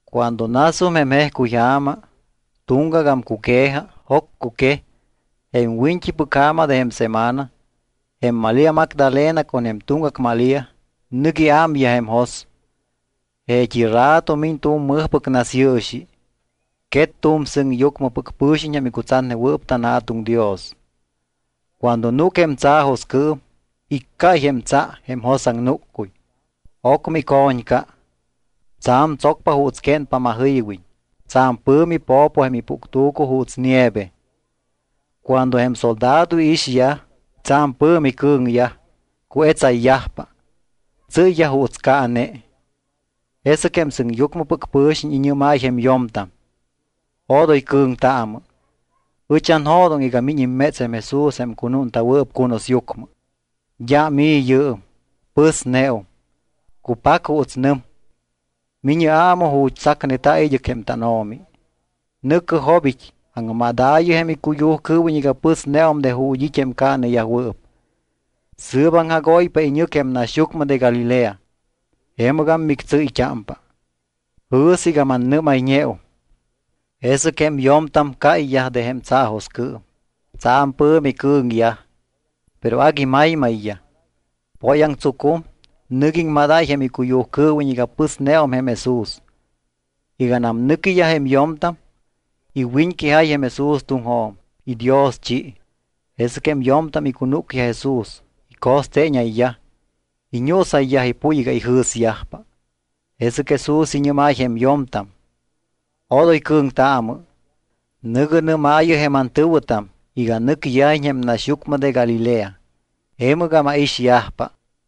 Cuando nasum jém jejcuyja̱ma, tuŋgagam cuque̱ja, joccuquej, jém wiñt́ipɨc ja̱ma de jém semana, jém Malía Magdalena con jém tuŋgac Malía nɨc iámyaj jém jos. Jeet́i rato miñ tu̱m mɨjpɨc nasyɨɨxi. Quet tu̱m sɨŋyucmɨpɨc pɨ̱xiñ jém icutsatnewɨɨp tanJa̱tuŋ Dios. Cuando núc jém tsaajoscɨɨm, iccáy jém tsa jém josaŋnúccuy, ocmɨ ico̱ñca. Tsa̱m tsocpa juuts quénpa majɨywiñ. Tsa̱m pɨ̱mi po̱po jém ipuctu̱cu juuts nieve. Cuando jém soldado iixyaj, tsa̱m pɨ̱mi cɨ̱ŋyaj, cuetsayyajpa. Tsɨ́yyaj juuts caane. Jesɨc jém sɨŋyucmɨpɨc pɨ̱xiñ iñɨ́máy jém yo̱mtam: —Odoy cɨ̱ŋtaamɨ. Ɨch anjo̱doŋ iga miñ imméts jém Jesús jém cunúnta̱wɨɨp cunusyucmɨ. D́am i̱ yɨɨm. Pɨsneum, cupac juuts nɨm. Mi̱ñɨ aamɨ ju̱t́ tsacneta̱ id́ɨc jém tánO̱mi. Nɨ̱cɨ jobit́, aŋmadaayɨ jém icuyujcɨɨwiñ iga pɨsneum de ju̱t́ it́ jém caaneyajwɨɨp. Sɨɨp aŋjagóypa iñɨc jém naxyucmɨ de Galilea. Jemɨgam mictsɨ́yt́ámpa. Jɨ̱sɨ iga mannɨ́mayñeum. Jesɨc jém yo̱mtam cáyyaj de jém tsaajoscɨɨm. Tsa̱m pɨ̱mi cɨ̱ŋyaj, pero agui maymayyaj. Póyaŋtsucum, nɨc iŋmadáy jém icuyujcɨɨwiñ iga pɨsneum jém Jesús. Iganam nɨquiyaj jém yo̱mtam, iwiñquejáy jém Jesús tuŋjo̱m. Idioschi. Jesɨc jém yo̱mtam icunúcyaj Jesús, ico̱steeñayyaj, iñuusayyaj ipuy iga ijɨ̱syajpa. Jesɨc Jesús iñɨ́máy jém yo̱mtam: —Odoy cɨ̱ŋtaamɨ. Nɨ̱gɨ nɨ́maayɨ jém antɨ̱wɨtam iga nɨcyajiñ jém naxyucmɨ de Galilea, jemɨgam aixyajpa.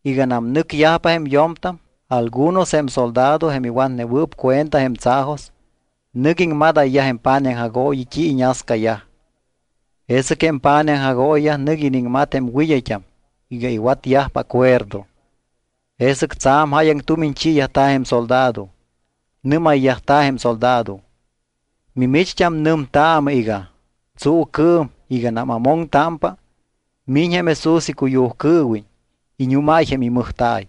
Iganam nɨcyajpa jém yo̱mtam algunos jém soldado jém iwatnewɨɨp cuenta jém tsaajos, nɨc iŋmadayyaj jém pa̱nij aŋjagooyi t́i iñascayaj. Jesɨc jém pa̱nij aŋjagooyiyaj nɨc iniŋmat jém wɨd́ayt́am iga iwatyajpa acuerdo. Jesɨc tsa̱m jáyaŋ tumiñ chiiyajta̱ jém soldado. Nɨ́mayyajta̱ jém soldado: —Mimicht́am nɨmtaamɨ iga: “Tsuucɨɨm iganam amoŋtámpa, miñ jém Jesús icuyujcɨɨwiñ; iñúmáy jém imɨjta̱y.”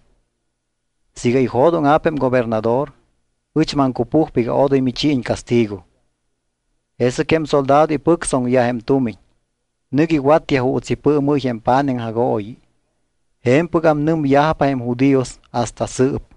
Siiga ijo̱dóŋa̱p jém gobernador, ɨch maŋcupujpa iga odoy michiiñ castigo. Jesɨc jém soldado ipɨctsoŋyaj jém tumiñ, nɨc iwatyaj juuts ipɨɨmɨ́y jém pa̱nij aŋjagooyi. Je̱mpɨgam nɨmyajpa jém judíos hasta sɨɨp.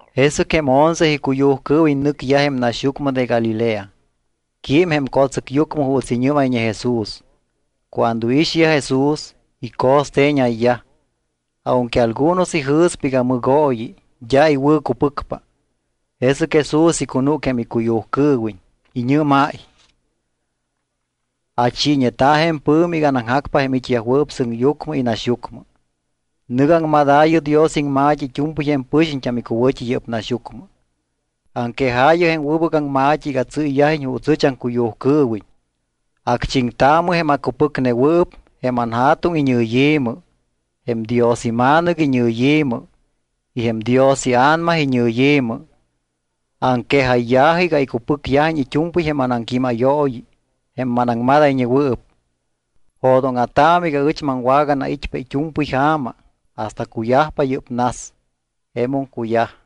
Jesɨc jém once icuyujcɨɨwiñ nɨcyaj jém naxyucmɨ de Galilea. Quím jém co̱tsɨcyucmɨ juuts iñɨ́mayñe Jesús. Cuando iixyaj Jesús, ico̱steeñayyaj. Aunque algunos ijɨ̱spa iga mɨgooyi, d́a iwɨ̱cupɨcpa. Jesɨc Jesús icunúc jém icuyujcɨɨwiñ. Iñɨ́máy: —Achiiñeta̱ jém pɨ̱mi iga anaŋjacpa jém it́yajwɨɨp sɨŋyucmɨ y naxyucmɨ. Nɨ̱gɨ aŋmadaayɨ Dios iŋma̱t́i it́u̱mpɨy jém pɨxiñt́am icuwɨ̱t́i yɨ́p naxyucmɨ. Aŋquejaayɨ jém wɨbɨc aŋma̱t́i iga tsɨ́yyajiñ juuts ɨch aŋcuyujcɨɨwiñ. Acchiŋtaamɨ jém acupɨcnewɨɨp jém anJa̱tuŋ iñɨyi̱mɨ, jém Dios iMa̱nɨc iñɨyi̱mɨ y jém Dios iA̱nama iñɨyi̱mɨ. Aŋquejayya̱jɨ iga icupɨcyajiñ it́u̱mpɨy jém anaŋquímayooyi jém manaŋmadayñewɨɨp. Jo̱dóŋa̱taamɨ iga ɨch maŋwaganait́pa it́u̱mpɨy ja̱ma hasta cuyajpa yɨ́p nas. Jemum cuyaj.